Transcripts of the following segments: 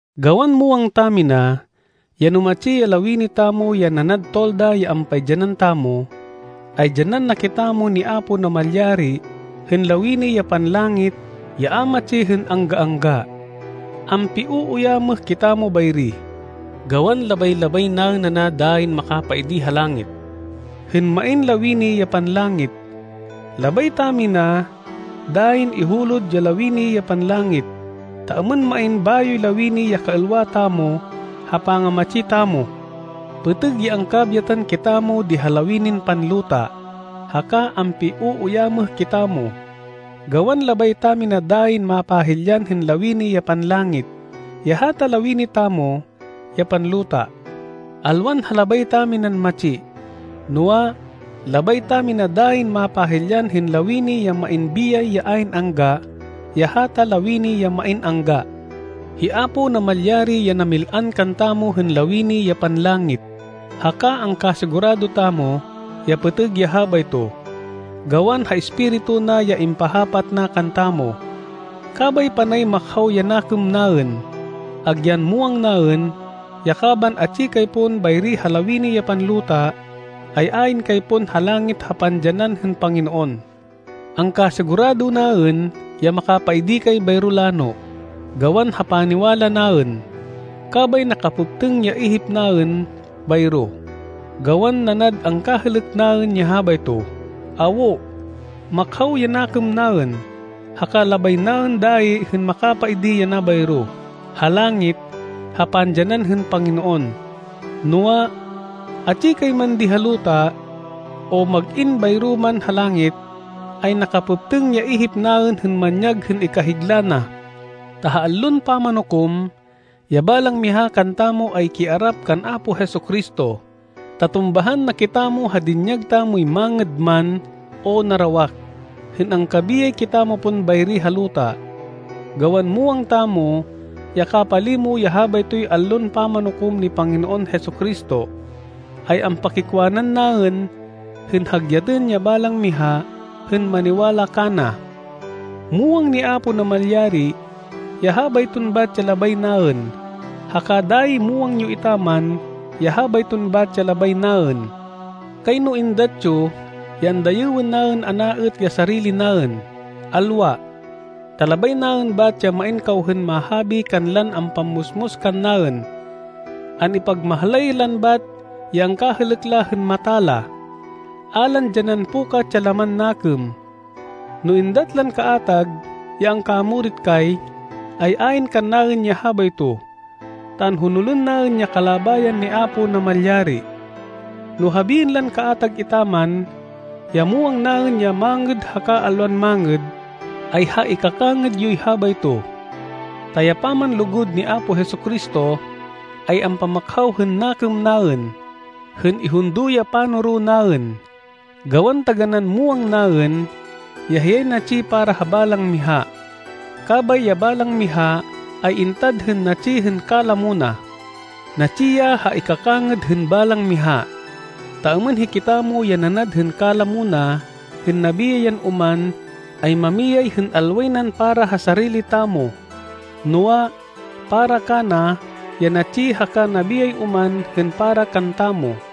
Gawan muwang tamina, ya no matsi ya lawini tamo ya nanad tolda ya ampaidyanan tamo, ay dyanan na kitamo ni Apo Namalyari hên lawini ya panlangit ya a matsi hên angga-angga. Ampiuuyamêh kitamo bayri, gawan labay-labay naên ana dayin makapaidi ha langit, hên main lawini ya panlangit. Labay tamina dayin ihulod ya lawini ya panlangit, ta êmên main bayoy lawini ya kaêlwa tamo, ha pangamatsi tamo. Pêtêg ya angkabyatan kitamo di ha lawinin panluta, haka ampiuuyamêh kitamo, gawan labay tamina dayin mapahilyan hên lawini ya panlangit, ya hata lawini tamo ya panluta. Alwan ha labay taminan matsi, noa, labay tamina dayin mapahilyan hên lawini ya main biyay ya ayn angga, ya hata lawini ya main angga. Hi Apo Namalyari ya namil-an kantamo hên lawini ya panlangit, haka angkasigurado tamo ya pêtêg ya habayto, gawan ha Espiritu na ya impahapat na kantamo. Kabay panay makhaw ya nakêm naên, agyan muwang naên, ya kaban atsi kay pon bayri ha lawini ya panluta, ay ayn kay pon ha langit ha pandyanan hên Panginoon. Angkasigurado naên ya makapaidi kay bayro lano, gawan ha paniwala naên, kabay nakapêptêng ya ihip naên bayro, gawan nanad angkahêlêk naên ya habayto. Awo. Makhaw ya nakêm naên. Haka labay naên dayi hên makapaidi yana bayro, ha langit, ha pandyanan hên Panginoon. Noa, atsi kay man di ha luta, o mag-in bayro man ha langit, ay nakapêptêng ya ihip naên hên manyag hên ikahigla na. Ta ha Allon Pamanukom, ya balang miha kantamo ay kiarap kan Apo Jesu-Cristo, ta tumbahan na kitamo ha dinyag tamoy mangêd man, o narawak, hên angkabiyay kitamo pon bayri ha luta. Gawan muwang tamo ya kapalimo ya habaytoy Allon Pamanukom ni Panginoon Jesu-Cristo, ay ampakikwanan naên hên hagyatên ya balang miha hên maniwala kana. Muwang ni Apo Namalyari ya habayton bat ya labay naên, haka dayi muwang yo etaman ya habayton bat ya labay naên. Kayno êndat yo ya andayêwên naên ana êt ya sarili naên. Alwa! Ta labay naên bat ya main kaw hên mahabi kanlan ampammusmus kannaên. An-ipagmahlay lan bat ya angkahêlêk la hên mata la, a lan dyanan pukat ya laman nakêm. No êndat lan kaatag ya angkamurit kay, ay ayn kannaên ya habayto, ta anhonolên naên ya kalabayan ni Apo Namalyari. No habiên lan kaatag etaman, ya muwang naên ya mangêd haka alwan mangêd, ay ha ikakangêd yoy habayto. Ta ya pamanlugud ni Apo Jesu-Cristo, ay ampamakhaw hên nakêm naên, hên ihundo ya panoro naên, gawan taganán muwang naên, ya hiyay natsi para ha balang miha, kabay ya balang miha ay intad hên natsi hên kalamo na. Natsi ya ha ikakangêd hên balang miha, ta êmên hikitamo ya nanad hên kalamo na hên nabiyay yan oman ay mamiyay hên alway nan para ha sarili tamo, noa, para kana ya natsi haka nabiyay oman hên para kantamo.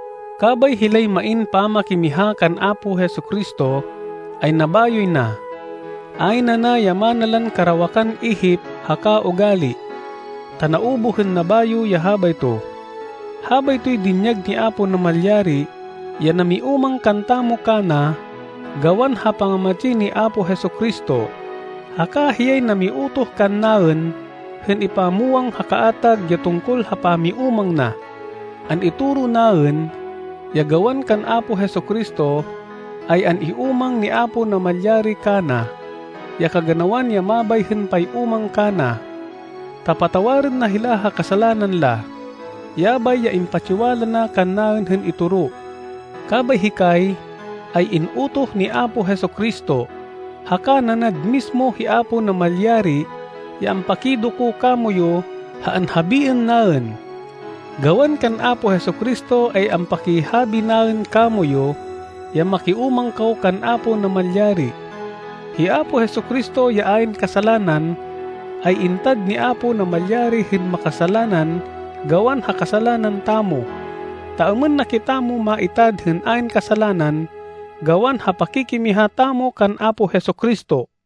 Kabay hilay main pamakimiha kan Apo Jesu-Cristo, ay nabayoy na. Ayn ana ya mana lan karawakan ihip haka ugali, ta naubuh hên nabayo ya habayto. Habaytoy dinyag ni Apo Namalyari ya namiúmang kantamo kana gawan ha pangamatsi ni Apo Jesu-Cristo. Haka hiyay namiutoh kannaên hên ipamwang ha kaatag ya tungkol ha pamiúmang na. An-itoro naên, ya gawan kan Apo Jesu-Cristo, ay an-iúmang ni Apo Namalyari kana, ya kaganawan ya mabay hên pay-úmang kana, ta patawarên na hila ha kasalanan la. Yabay ya impatsiwala na kannaên hên itoro. Kabay hikay, ay in-utoh ni Apo Jesu-Cristo, haka nanad mismo hi Apo Namalyari ya ampakidoko kamoyu ha anhabiên naên. Gawan kan Apo Jesu-Cristo ay ampakihabi naên kamoyu, ya makiúmang kaw kan Apo Namalyari. Hi Apo Jesu-Cristo ya ayn kasalanan, ay intad ni Apo Namalyari hên makasalanan gawan ha kasalanan tamo, ta êmên na kitamo maitad hên ayn kasalanan gawan ha pakikimiha tamo kan Apo Jesu-Cristo.